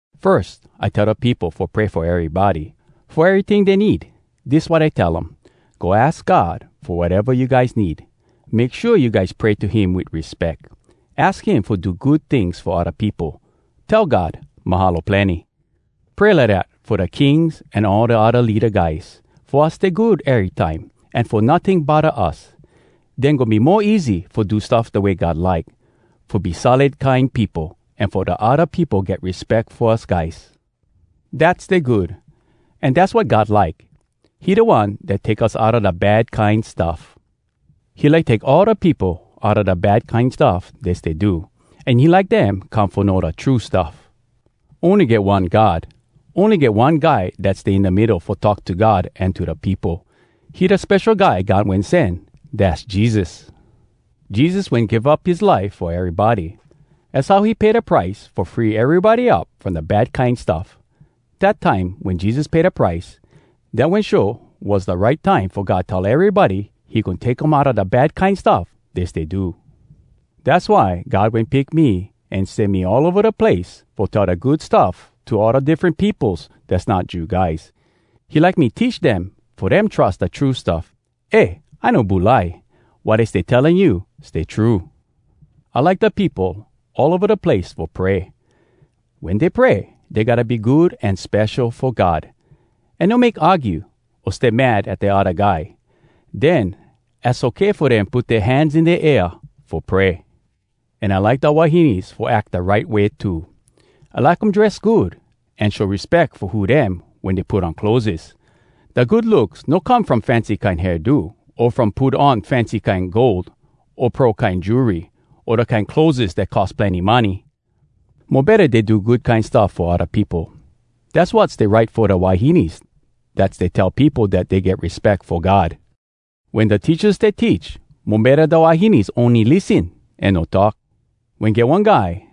Firs, I tell da peopo fo pray fo erybody, fo eryting dey need. Dis wat I tell um: Go aks God fo wateva you guys need. Make shua you guys pray to him wit respeck. Aks him fo do good tings fo odda peopo. Tell God, “Mahalo plenny!” Pray lidat fo da kings an all da odda leada guys, fo us stay good erytime, an fo notting bodda us. Den goin be mo easy fo do stuff da way God like, fo be solid kine peopo, an fo da odda peopo get respeck fo us guys. Dat stay good, an dass wat God like. He da One dat take us outa da bad kine stuff. He like take all da peopo outa da bad kine stuff dey stay do, an he like dem come fo know da true stuff. Ony get one God. Ony get one Guy dat stay in da middo fo talk to God an to da peopo. He da Spesho Guy God Wen Sen Dass Jesus! Jesus wen give up his life fo erybody. Az how he pay da price fo free erybody up From da bad kine stuff. Dat time, wen Jesus pay da price, Dat wen show was da right time Fo God tell erybody he goin take um outa da bad kine stuff dey stay do. Dass why God wen pick me, an sen me all ova da place fo tell da Good Stuff to all da diffren peopos dass not Jew guys. He like me teach dem fo dem trus da true stuff. Eh, I no bulai. Wat I stay telling you stay true. I like da peopo all ova da place fo pray. Wen dey pray, dey gotta be good an spesho fo God, an no make argue o stay mad at da odda guy. Den az okay fo dem put dea hands in da air fo pray. An I like da wahines fo ack da right way too. I like um dress good, an show respeck fo who dem wen dey put on clotheses. Da good looks no come from fancy kine hairdo, o from put on fancy kine gold o pearl kine jewelry, o da kine clotheses dat cost plenny money. Mo betta dey do good kine stuff fo odda peopo. Dass wat stay right fo da wahines dat stay tell peopo dat dey get respeck fo God. Wen da teachas stay teach, mo betta da wahines ony lissen an no talk. Wen get one guy,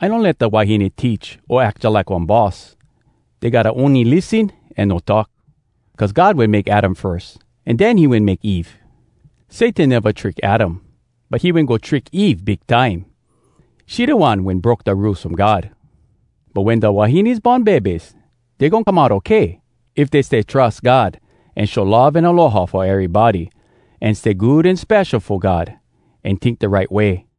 I no let da wahines teach o ack jalike one boss. Dey gotta ony lissen an no talk. Cuz God wen make Adam firs, an den he wen make Eve. Satan neva trick Adam, but he wen go trick Eve big time. She da one wen broke da Rules From God. But wen da wahines born bebes, dey goin come out okay, if dey stay trus God, an show love an aloha fo erybody, an stay good an spesho fo God, an tink da right way.